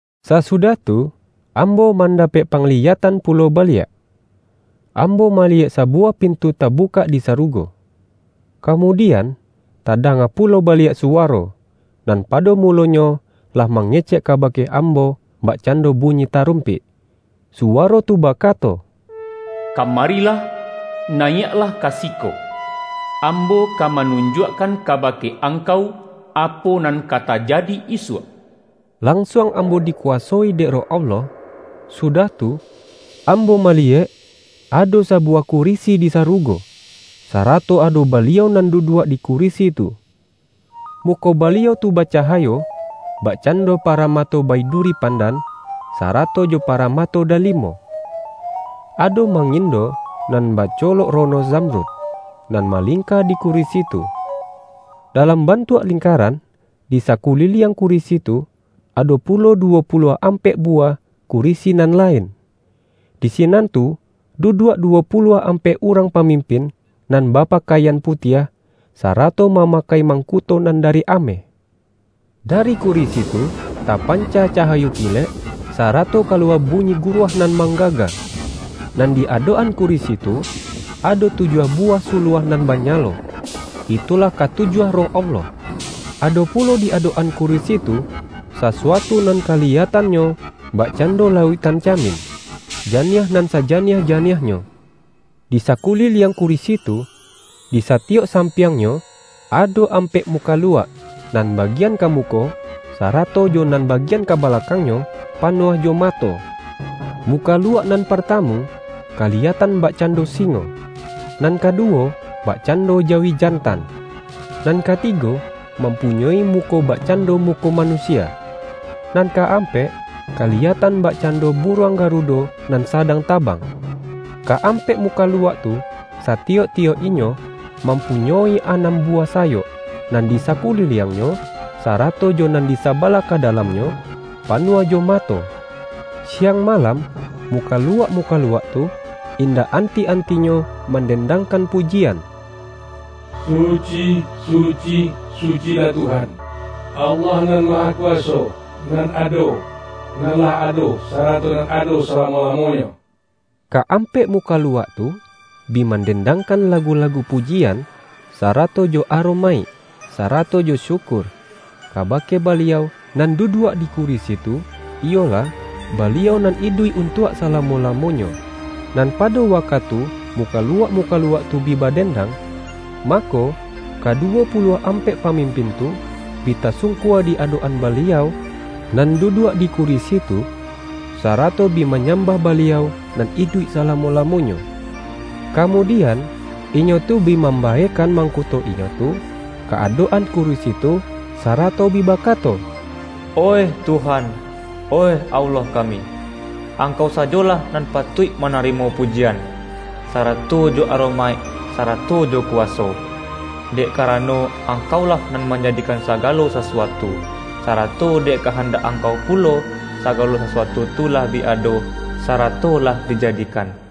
Sasudah tu, ambo mandapek pangliyatan pulo baliak. Ambo maliyek sabuwah pintu tabukak di sarugo. Kamudian, tadanga pulo ba-liak suwaro, nan pado mulonyo lah mangecek kabake ambo bakcando bu-nyi tarumpik. Suwaro tu bakato,”Ka-marilah, nayiak lah ka siko. Ambo ka manunjuakkan kabake angkau apo nan ka tajadi isuak.” Lansuang am-bo dikuwasoi dek Roh Allah. Sudah tu, ambo maliyek ado sabuwah ku-risi di sarugo, sarato ado Baliau nan duduak di kurisi tu. Muko Baliau tu bacahayo, bakcando paramato baidu-ri pandan, sarato jo paramato dalimo. Ado mangindo nan bacolok rono zam-rud, nan malingka di kurisi tu. Dalam bantuak lingkaran, di sa-kuliliang kurisi tu, ado pulo duwo puluah ampek buwah kurisi nan la-in. Di sinan tu, duduak duwo puluah ampek urang pamimpin nan bapa-kaian putiah, sarato mamakai mang-kuto nan dari ameh. Dari kurisi tu, tapanca cahayo kilek, sarato kaluwa bunyi guruah nan manggaga. Nan di adok-an kurisi tu, ado tujuah buwah suluah nan banyalo; itulah katujuah Roh Allah. Ado pulo di adok-an ku-risi tu, sasuatu nan kaliyatannyo bak-cando lauiktan camin, janiah nan sa-janiah-janiahnyo. Di sakuliliang kurisi tu, di satiyok sampiangnyo, ado ampek mukaluak, nan bagian ka muko, sarato jo nan bagian ka balakangnyo, panuah jo mato. Mukaluak nan partamu, kali-yatan bakcando singo. Nan kaduwo, bakcando jawi jantan. Nan katigo, mampunyoi muko bakcando muko manusia. Nan ka-ampek, kaliyatan bakcando buruang garudo nan sadang tabang. Ka-ampek mukaluak tu, sati-yok-tiyok inyo, mampunyoi anam bu-wah sayok, nan di sakuliliangnyo, sa-rato jo nan di sabalah ka dalamnyo, panuah jo mato. Siang malam, muka-luak-mukaluak tu, indak anti-antinyo mandendangkan pujian,”Suci, suci, sucilah Tuhan, Allah Nan Mahakuwaso; nan ado, nan lah ado, sarato nan ado salamo-lamonyo.” Ka-ampek mukaluak tu, bi man-dendangkan lagu-lagu pujian, sara-to jo aromaik, sarato jo syukur, ka-bake Baliau nan duduak di kurisi tu, iyolah, Baliau nan iduik untuak sala-mo-lamonyo. Nan pado wakatu mu-kaluak-mukaluak tu bi badendang, mako, kaduwo puluah ampek pamimpin tu, bi tasungkua di adok-an Baliau nan duduak di kurisi tu, sara-to bi manyambah Baliau nan iduik salamo-lamonyo. Kamudian, inyo tu bi mambaekan mangkuto inyo tu ka adok-an kurisi tu, sarato bi bakato, ”Oih Tuhan, oih Allah kami! Angkau sajolah nan patuik manarimo pujian, sarato jo aromaik, sarato jo kuwaso. Dek karano, Angkau-lah nan manjadikan sagalo sasuatu, sarato dek kahandak Angkau pulo, sagalo sasuatu tu lah bi ado, sarato lah dijadikan.”